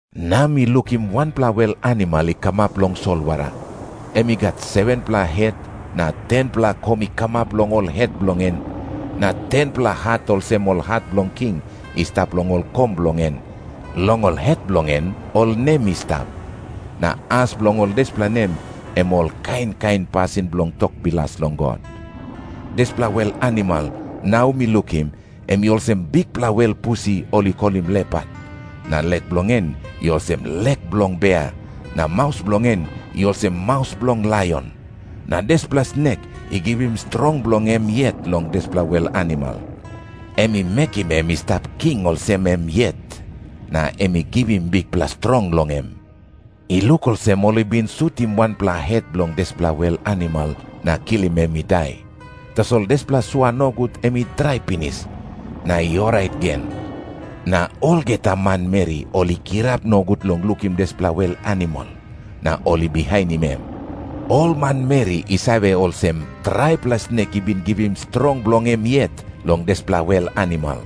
Na mi lukim wanpela wel animal i kamap long solwara. Em i gat 7-pela het na 10-pela kom i kamap long ol het bilong en. Na 10-pela hat olsem ol hat bilong king i stap long ol kom bilong en. Long ol het bilong en ol nem i stap, na as bilong ol dispela nem em ol kain kain pasin bilong tok bilas long God. Dispela wel animal nau mi lukim, em i olsem bikpela wel pusi ol i kolim lepat, na lek bilong en i olsem lek bilong bea, na maus bilong en i olsem maus bilong laion. Na dispela snek i givim strong bilong em yet long dispela wel animal. Em i mekim em i stap king olsem em yet, na em i givim bikpela strong long em. I luk olsem ol i bin sutim wanpela het bilong dispela wel animal na kilim em i dai. Tasol dispela sua nogut em i drai pinis, na i orait gen. Na olgeta manmeri ol i kirap nogut long lukim dispela wel animal, na ol i bihainim em. Ol manmeri i save olsem traipela snek i bin givim strong bilong em yet long dispela wel animal,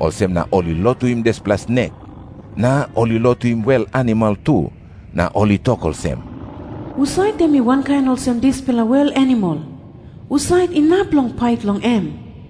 olsem na ol i lotuim dispela snek. Na ol i lotuim wel animal tu, na ol i tok olsem, “Husat em i wankain olsem dispela wel animal? Husat inap long pait long em?”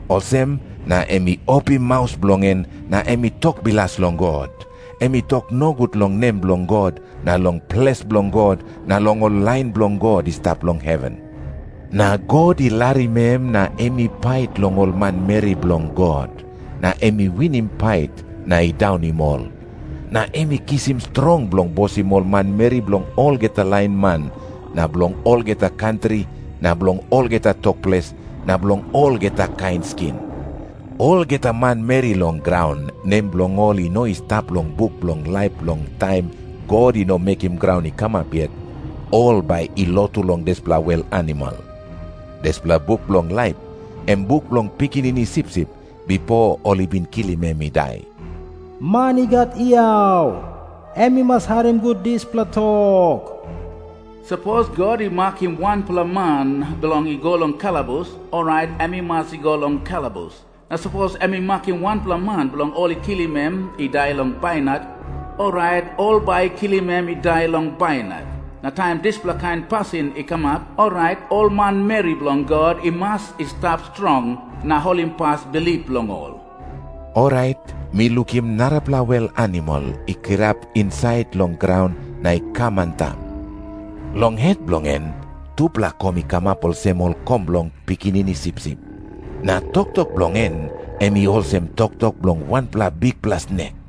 Olsem na em i opim maus bilong en na em i tok bilas long God. Em i tok nogut long nem bilong God na long ples bilong God na long ol lain bilong God i stap long heven. Na God i larim em na em i pait long ol manmeri bilong God, na em i winim pait na i daunim ol. Na em i kisim strong bilong bosim ol manmeri bilong olgeta lain man na bilong olgeta kantri na bilong olgeta tok ples na bilong olgeta kain skin. Olgeta manmeri long graun, nem bilong ol i no i stap long buk bilong laip long taim God i no mekim graun i kamap yet, ol bai i lotu long dispela wel animal. Dispela buk bilong laip, em buk bilong Pikinini Sipsip, bipo ol i bin kilim em i dai. Man i gat yau, em i mas harim gut dispela tok. Sapos God i makim wanpela man bilong i go long kalabus, orait em i mas i go long kalabus. Na sapos em i makim wanpela man bilong ol i kilim em i dai long bainat, orait ol bai i kilim em i dai long bainat. Na taim dispela kain pasin i kamap, orait ol manmeri bilong God i mas i stap strong na holimpas bilip bilong ol. Orait mi lukim narapela wel animal i kirap insait long graun na i kam antap. Long het bilong en tupela kom i kamap olsem ol kom bilong pikinini sipsip, na toktok bilong en em i olsem toktok bilong wanpela bikpela snek.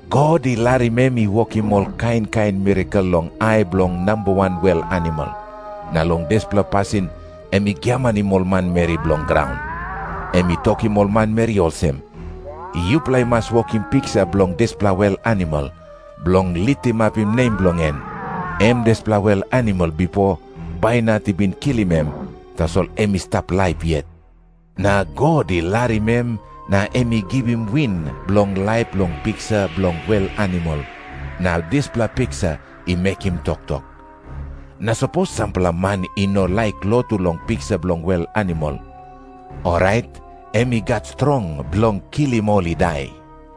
God i larim em i wokim ol kain kain mirakel long ai bilong namba wan wel animal, na long dispela pasin em i giamanim ol manmeri bilong graun. Em i tokim ol manmeri olsem, “Yupela i mas wokim piksa bilong dispela wel animal, bilong litimapim nem bilong en. Em dispela wel animal bipo bainat i bin kilim em, tasol em i stap laip yet.” Na God i larim em na em i givim win bilong laip long piksa bilong wel animal, na dispela piksa i mekim toktok. Na sapos sampela man i no laik lotu long piksa bilong wel animal, orait em i gat strong bilong kilim ol i dai.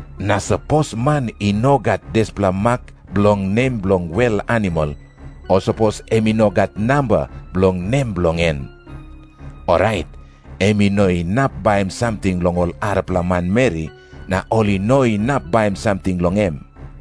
Na sapos man i no gat dispela mak bilong nem bilong wel animal o sapos em i no gat namba bilong nem bilong en, orait em i no inap baim samting long ol arapela manmeri na ol i no inap baim samting long em.